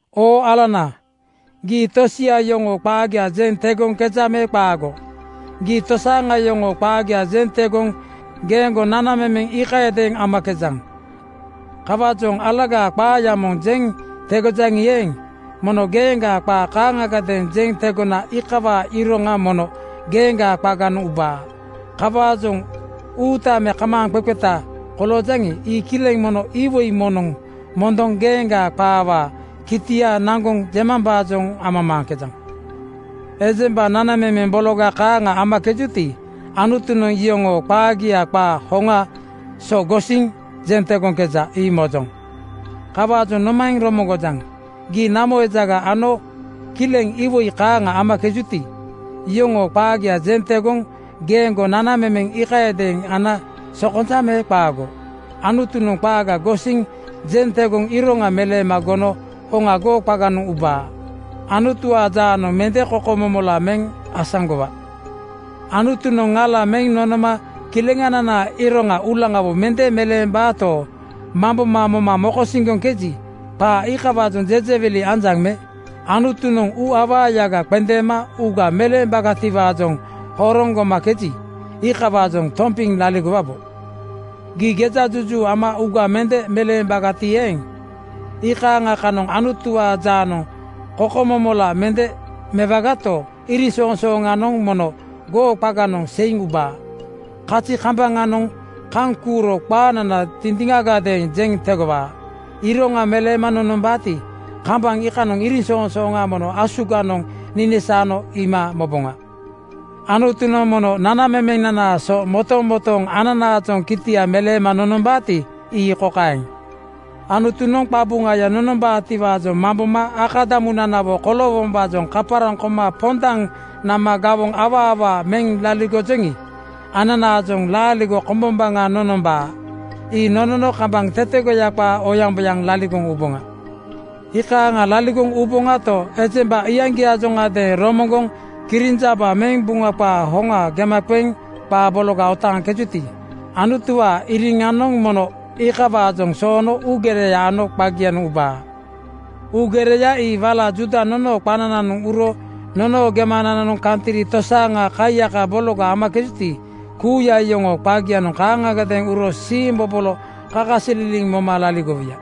Oo alana, gii tosia yoŋoo qaagia jeŋ tegoŋkejaŋ me qaago? Gii tosaaŋa yoŋoo qaagia jeŋ tegoŋ geeŋgo nanamemeŋ iikayadeeŋ amakejaŋ. Kawaajoŋ alagaa qaaya moŋ jeŋ tegojaŋi eeŋ, mono geeŋgaa qaa kaaŋagadeeŋ jeŋ tegona iikawaa iroŋanoŋ mono geeŋgaa qaganoŋ ubaa. Kawaajoŋ uuta me kamaaŋqeqeta koloojaŋi, ii kileŋ mono iwoi moŋnoŋ mondoŋ geeŋgaa qaawaa kitia naŋgoŋ jemambaajoŋ amamaaŋkejaŋ. Ejemba nanamemeŋ bologa kaaŋa amakejuti, Anutunoŋ iyoŋoo qaagia qaa hoŋaa so gosiŋ jeŋ tegoŋkeja, ii mojoŋ. Kawaajoŋ nomaeŋ romoŋgojaŋ? Gii namo ejaga ano kileŋ iwoi kaaŋa amakejuti, iyoŋoo qaagia jeŋ tegoŋ geeŋgo nanamemeŋ iikayadeeŋ ana sokonja me qaago? Anutunoŋ qaaga gosiŋ jeŋ tegoŋ iroŋa meleema gono hoŋa goo qaganoŋ ubaa. Anutuwaa jaanoŋ mende kokomomola meŋ asaŋgowaga. Anutunoŋ ŋala meŋ nonoma kileŋananaa iroŋa uulaŋawo mende meleembaato, mamboma moma mokosiŋgoŋkeji, qaa iikawaajoŋ jejewili anjaŋ me? Anutunoŋ uuawagaya qendeema uuga meleembagatiwaajoŋ horoŋ gomakeji, iikawaajoŋ tompiŋ laligowabo. Gii gejajuju ama uuga mende meleembagati eeŋ, iikaaŋa kanoŋ Anutuwaa jaanoŋ kokomomola mende mewagato, iriŋsoŋsooŋanoŋ mono goo qaganoŋ seiŋ ubaa. Kazi kambaŋanoŋ kaŋ kuuro qaanana dindiŋagadeeŋ jeŋ tegowaa. Iroŋa meleema nonombaati, kambaŋ iikanoŋ iriŋsoŋsooŋa mono asuganoŋ ninisaano iima moboŋa. Anutunoŋ mono “Nanamemenanaa so motomotooŋ ananaajoŋ kitia meleema nonombaati,” ii kokaeŋ: Anutunoŋ qabuŋaya nonombaatiwaajoŋ mamboma akadamunanawo koloowombaajoŋ kaparaŋ koma pondaŋ nama gawoŋ awaa awaa meŋ laligojoŋi, ananaajoŋ laaligo kombombaŋa nonombaa. Ii nonono kambaŋ tetegoya qaa oyaŋboyaŋ laligoŋ uboŋa. Iikaaŋa laligoŋ uboŋato, ejemba iyaŋgiaajoŋadeeŋ romoŋgoŋ kirinjaba meŋ Buŋa qaa hoŋa gema qeŋ qaa bologa otaaŋkejuti, Anutuwaa iriŋanoŋ mono iikawaajoŋ soono uugereya ano qagianoŋ ubaa. Uugereya ii wala Juuda nonoo qanananoŋ uro nonoo gemanananoŋ kantri tosaaŋa kaiyaka bologa amakejuti, kuuya iyoŋoo qagianoŋ kaaŋagadeeŋ uro siimbobolo kakasililiŋ moma laligowuya.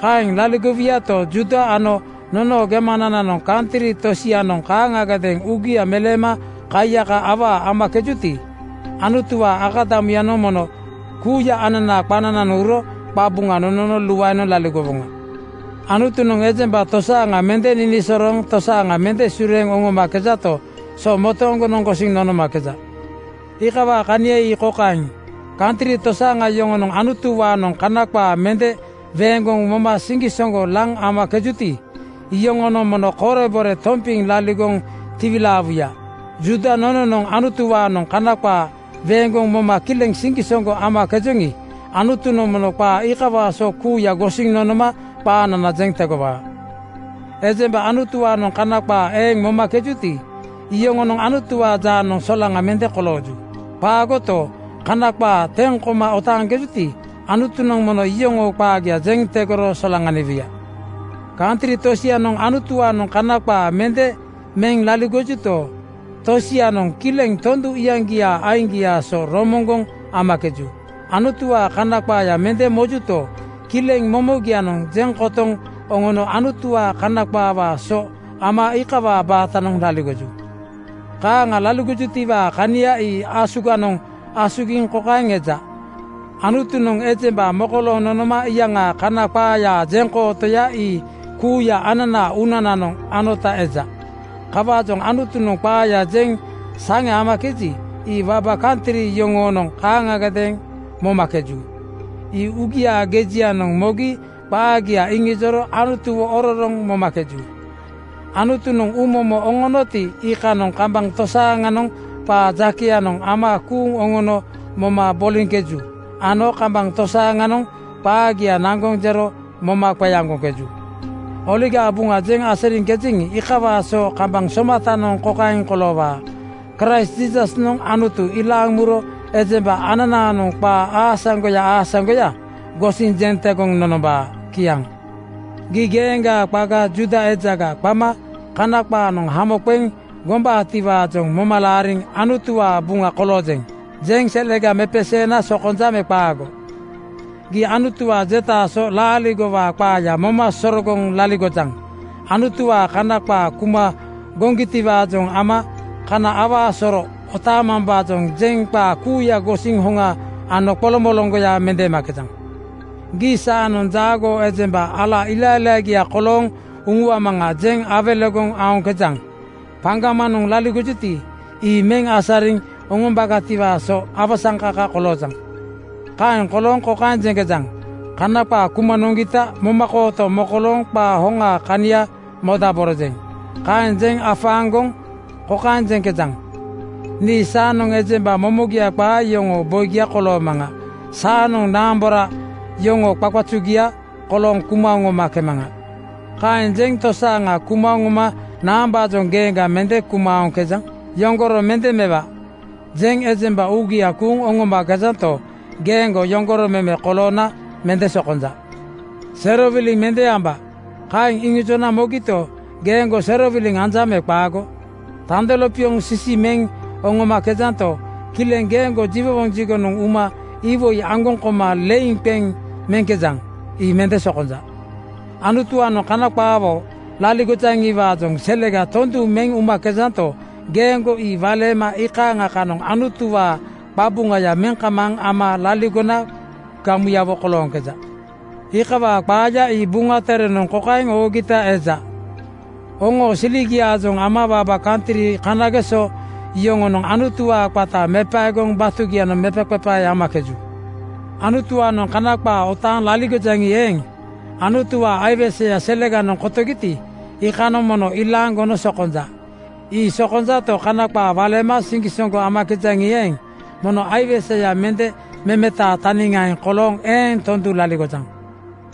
Kaeŋ laligowuyato, Juuda ano nonoo gemanananoŋ kantri tosianoŋ kaaŋagadeeŋ uugia meleema kaiyaka awaa amakejuti, Anutuwaa akadamuyanoŋ mono kuuya ananaa qanananoŋ uro qabuŋa nonono luaenoŋ laligowoŋa. Anutunoŋ ejemba tosaaŋa mende ninisorooŋ tosaaŋa mende sureeŋ oŋomakejato, so motooŋgonoŋ gosiŋ nonomakeja. Iikawaa kania ii kokaeŋ: Kantri tosaaŋa yoŋonoŋ Anutuwaanoŋ Kana qaa mende weeŋgoŋ moma siŋgisoŋgo laŋ amakejuti, iyoŋonoŋ mono korebore tompiŋ laligoŋ tiwilaawuya. Juuda nononoŋ Anutuwaanoŋ Kana qaa weeŋgoŋ moma kileŋ siŋgisoŋgo amakejoŋi, Anutunoŋ mono qaa iikawaa so kuuya gosiŋ nonoma qaanana jeŋ tegowaa. Ejemba Anutuwaanoŋ Kana qaa eeŋ momakejuti, iyoŋonoŋ Anutuwaa jaanoŋ solaŋa mende kolooju. Qaagoto, Kana qaa teŋ koma otaaŋkejuti, Anutunoŋ mono iyoŋoo qaagia jeŋ tegoro solaŋaniwuya. Kantri tosianoŋ Anutuwaanoŋ Kana qaa mende meŋ laligojuto, tosianoŋ kileŋ tondu iyaŋgiaa aiŋgiaa so romoŋgoŋ amakeju. Anutuwaa kana qaaya mende mojuto, kileŋ momogianoŋ jeŋ kotoŋ oŋono Anutuwaa kana qaawaa so ama iikawaa baatanoŋ laligoju. Kaaŋa laligojutiwaa kania ii asuganoŋ asugiŋ kokaeŋ eja: Anutunoŋ ejemba mokolooŋ nonoma iikanoŋ Kana qaayaa jeŋkootoya ii kuuya ananaa uunananoŋ anota eja. Kawaajoŋ Anutunoŋ qaaya jeŋ saŋe amakeji, ii waba kantri yoŋonoŋ kaaŋagadeeŋ momakeju. Ii uugiaa gejianoŋ mogi qaagia iŋijoro Anutuwo ororoŋ momakeju. Anutunoŋ uumomo oŋonoti, iikanoŋ kambaŋ tosaaŋanoŋ qaa jakeyanoŋ ama kuuŋ oŋono moma boliŋkeju ano kambaŋ tosaaŋanoŋ qaagia naŋgoŋ jero moma qeaŋgoŋkeju. Oligaa Buŋa jeŋ asariŋkejeŋi, iikawaa so kambaŋ somatanoŋ kokaeŋ koloowaa: Kraist Jiisasnoŋ Anutu ilaaŋ muro ejemba ananaanoŋ qaa aasaŋgoya aasaŋgoya gosiŋ jeŋ tegoŋ nonombaa. Kiaŋ. Gii geeŋgaa qaga Juuda ejaga qama Kana qaanoŋ hamo qeŋ gombaatiwaajoŋ moma laariŋ “Anutuwaa buŋa koloojeŋ,” jeŋ selega mepeseena sokonja me qaago? Gii Anutuwaa jetaa so laaligowaa qaaya moma sorogoŋ laligojaŋ. Anutuwaa Kana qaa kuma goŋgitiwaajoŋ ama kana awaa soro otaamambaajoŋ jeŋ qaa kuuya gosiŋ hoŋa ano qoloŋmoloŋgoya mendeemakejaŋ. Gii “Saanoŋ jaagoo ejemba ala ilailaagia kolooŋ uŋuamaŋa,” jeŋ awelegoŋ aoŋkejaŋ. Paŋgamanoŋ laligojuti, ii meŋ asariŋ oŋombagatiwaa so awasaŋkaka koloojaŋ. Kaeŋ kolooŋ kokaeŋ jeŋkejaŋ, “Kana qaa kuma noŋgita momakooto mokolooŋ qaa hoŋaa kania modaborojeŋ.” Kaeŋ jeŋ afaaŋgoŋ kokaeŋ jeŋkejaŋ, “Nii saanoŋ ejemba momogia qaa yoŋoo boigia koloomaŋa. Saanoŋ naambora yoŋoo qaqazugia kolooŋ kuma oŋomakemaŋa.” Kaeŋ jeŋ tosaaŋa kuma oŋoma naambaajoŋ geeŋga mende kuma aoŋkejaŋ? “Yoŋgoro mende mewa,” jeŋ ejemba uugia kuuŋ oŋomakejanto, geeŋgo yoŋgoro meme koloona mende sokonja. “Serowiliŋ mende amba,” kaeŋ iŋijona mogito, geeŋgo serowiliŋ anjaŋ me qaago? Tando lopioŋ sisi meŋ oŋomakejanto, kileŋ geeŋgo jiwowoŋ jigonoŋ uma iwoi aŋgoŋ koma leiŋ qeŋ meŋkejaŋ. Ii mende sokonja. Anutuwaanoŋ Kana qaawo laligojaŋiwaajoŋ selega tondu meŋ umakejanto, geeŋgo ii waleema iikaaŋa kanoŋ Anutuwaa qabuŋaya meŋ kamaaŋ ama laligona gamuyawo kolooŋkeja. Iikawaa qaaya ii Buŋa Terenoŋ kokaeŋ oogita eja, “Oŋoo siligiaajoŋ ama waba kantri kanageso yoŋonoŋ Anutuwaa qata mepaegoŋ batugianoŋ mepaqepae amakeju.” Anutuwaanoŋ Kana qaa otaaŋ laligojaŋi eeŋ, Anutuwaa aiweseya seleganoŋ kotogiti, iikanoŋ mono ilaaŋ gono sokonja. Ii sokonjato, kana qaa waleema siŋgisoŋgo amakejaŋi eeŋ, mono aiweseya mende memetaa taniŋaeŋ kolooŋ eeŋ tondu laligojaŋ.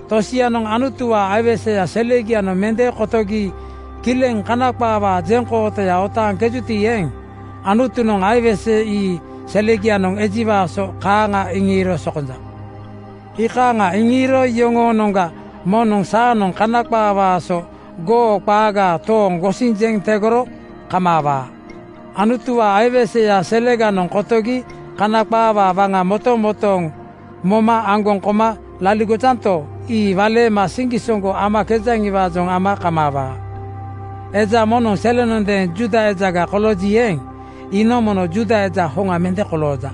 Tosianoŋ Anutuwaa aiweseya selegianoŋ mende kotogi kileŋ kana qaawaa jeŋkootoya otaaŋkejuti eeŋ, Anutunoŋ aiwese ii selegianoŋ ejiwaa so kaaŋa iŋiiro sokonja. Iikaaŋa iŋiiro yoŋoonoŋga moŋnoŋ saanoŋ Kana qaawaa so goo qaaga tooŋ gosiŋ jeŋ tegoro kamaawaa. Anutuwaa aiweseya seleganoŋ kotogi Kana qaawaa waŋa motomotooŋ moma aŋgoŋ koma laligojanto, ii waleema siŋgisoŋgo amakejaŋiwaajoŋ ama kamaawaa. Eja moŋnoŋ selenondeeŋ Juuda ejaga kolooji eeŋ, iinoŋ mono Juuda eja hoŋa mende kolooja.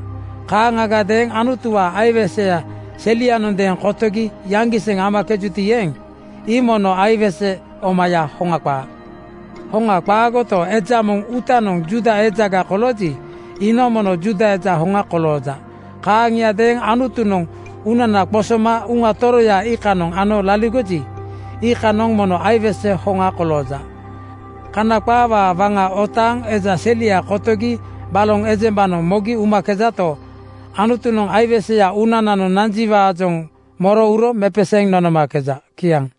Kaaŋagadeeŋ Anutuwaa aiweseya selianondeeŋ kotogi yaŋgiseŋ amakejuti eeŋ, ii mono aiwese omaya, hoŋa qaa. Hoŋa qaagoto, eja moŋ uutanoŋ Juuda ejaga kolooji, iinoŋ mono Juuda eja hoŋa kolooja. Kaaŋiadeeŋ Anutunoŋ uunana qosoma Uŋaya Toroya iikanoŋ ano laligoji, iikanoŋ mono aiwese hoŋa kolooja. Kana qaawaa waŋa otaaŋ eja selia kotogi baloŋ ejembanoŋ mogi umakejato, Anutunoŋ aiweseya uunananoŋ nanjiwaajoŋ moro uro mepeseeŋ nonomakeja. Kiaŋ.